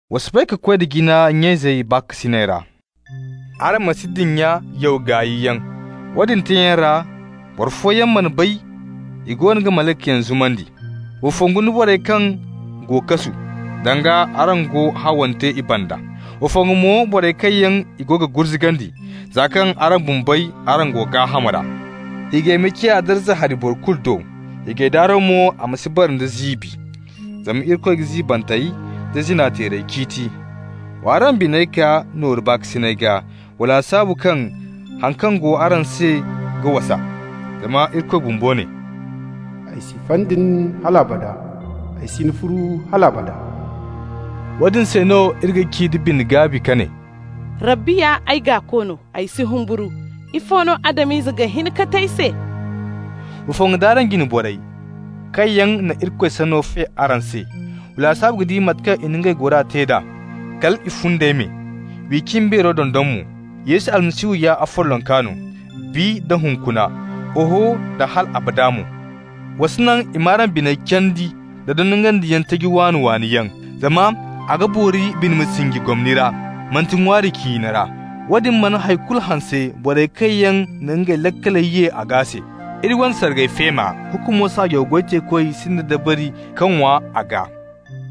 Wa soobay ka koy da jina nya-izey baakasinay ra. Araŋ ma si dinya yaw gaayyaŋ. Woodin teeyaŋ ra boro fooyaŋ mana bay i goono ga malaykayaŋ zumandi. Wa fongu nda borey kaŋ go kasu, danga araŋ go hawante i banda. Wa fongu mo da borey kaŋ yaŋ i go ga gurzugandi, za kaŋ araŋ bumbey, araŋ go gaaham ra. Hiijay ma ciya darza hari boro kulu do, hiijay daaro mo ma si bara nda ziibi. Zama Irikoy ga ziibantey da zina-teerey ciiti. Wa araŋ biney kaa nooru baakasinay gaa. Wa lasaabu kaŋ haŋ kaŋ go araŋ se ga wasa. Zama Irikoy bumbo ne: «Ay si fay da nin hal abada! Ay si ni furu hal abada!» Woodin se no iri ga ci da bine-gaabi ka ne: «Rabbi ya ay gaako no, ay si humburu. Ifo no Adam-ize ga hin ka te ay se?» Wa fongu nd'araŋ jine borey kaŋ yaŋ na Irikoy Sanno fe araŋ se. Wa lasaabu ka di mate kaŋ i na ngey gora te d'a kal i fundey me, w'i cimbeero dondon mo. Yesu Almasihu ya afollonka no -- bi da hunkuna, oho, da hal abada mo. Wa si naŋ i m'araŋ biney candi nda dondonandiyaŋ taji waani-waani yaŋ, zama a ga boori bine ma sinji gomni ra, manti ŋwaari ciine ra. Woodin mana hay kulu hanse borey kaŋ na ngey laakaley ye a gaa se. Iri wane sargay feema, hukumo saajaw goy teekoy sinda dabari ka ŋwa a gaa.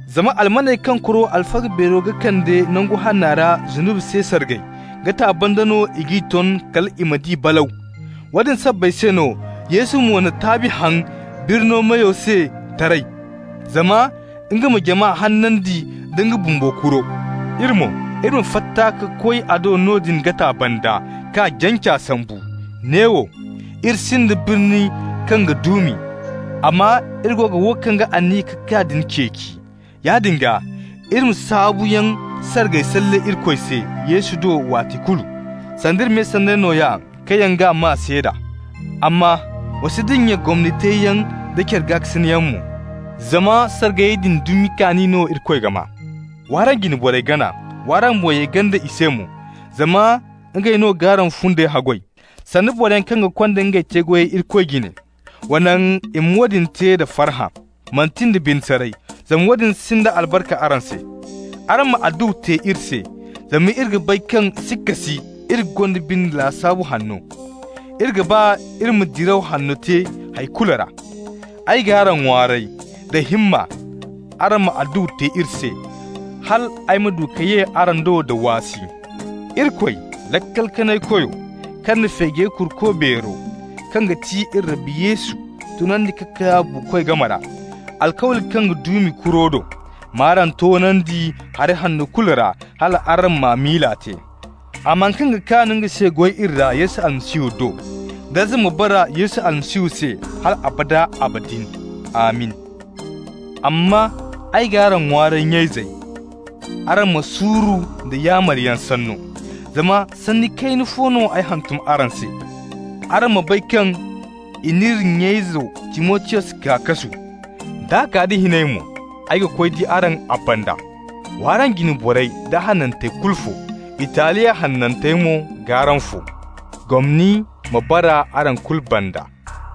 Zama almaney kaŋ kuro alfaga beero ga kande Nangu Hanna ra zunubi se sargay, gata banda no i g'i ton kal i ma di balaw. Woodin sabbay se no Yesu mo na taabi haŋ birni meyo se taray, zama nga ma jama hanandi nda nga bumbo kuro. Iri mo, iri ma fatta ka koy a do noodin gata banda, k'a janca sambu. Neewo, iri sinda birni kaŋ ga duumi, amma iri go ga wo kaŋ ga aniya ka kaa din ceeci. Yaadin gaa, iri ma saabuyaŋ sargay salle Irikoy se Yesu do waati kulu, sanda iri me sanney nooya kaŋ yaŋ g'a maa seeda. Amma wa si dinya gomni teeyaŋ da care gaakasinayyaŋ mo, zama sargayey din dumi kaani no Irikoy ga maa. W'araŋ jine borey gana. W'araŋ boŋ ye ganda i se mo, zama ngey no g'araŋ fundey haggoy, sanda boroyaŋ kaŋ ga konda ngey te-goyey Irikoy jine. Wa naŋ i ma woodin te da farhã, manti nda bine saray, zama woodin sinda albarka araŋ se. Araŋ ma adduwa te iri se. Zama iri ga bay kaŋ sikka si iri gonda bine lasaabu hanno. Iri ga ba iri ma diraw hanno te hay kulu ra. Ay g'araŋ ŋwaaray da himma araŋ ma adduwa te iri se, hal ay ma du ka ye araŋ do da waasi. Irikoy Laakal-Kanay-Koyo kaŋ na feejey Kuruko beero, kaŋ ga ti iri Rabbi Yesu, tunandi ka kaa buukoy game ra, alkawli kaŋ ga duumi kuro do, m'araŋ toonandi hari hanno kulu ra hal araŋ m'a miila te. A ma haŋ kaŋ ga kaan nga se goy iri ra Yesu Almasihu do. Darza ma bara Yesu Almasihu se hal abada abadin! Amin! Amma ay g'araŋ ŋwaaray, nya-izey, araŋ ma suuru nda yaamaryaŋ sanno, zama sanni kayna fo no ay hantum araŋ se. Araŋ ma bay kaŋ i n'iri nya-izo Timotiyos kaa kasu. D'a kaa da hinay mo, ay ga koy di araŋ a banda. Wa araŋ jine borey da hanantey kulu fo. Italiya hanantey mo go g'araŋ fo. Gomni ma bara araŋ kulu banda.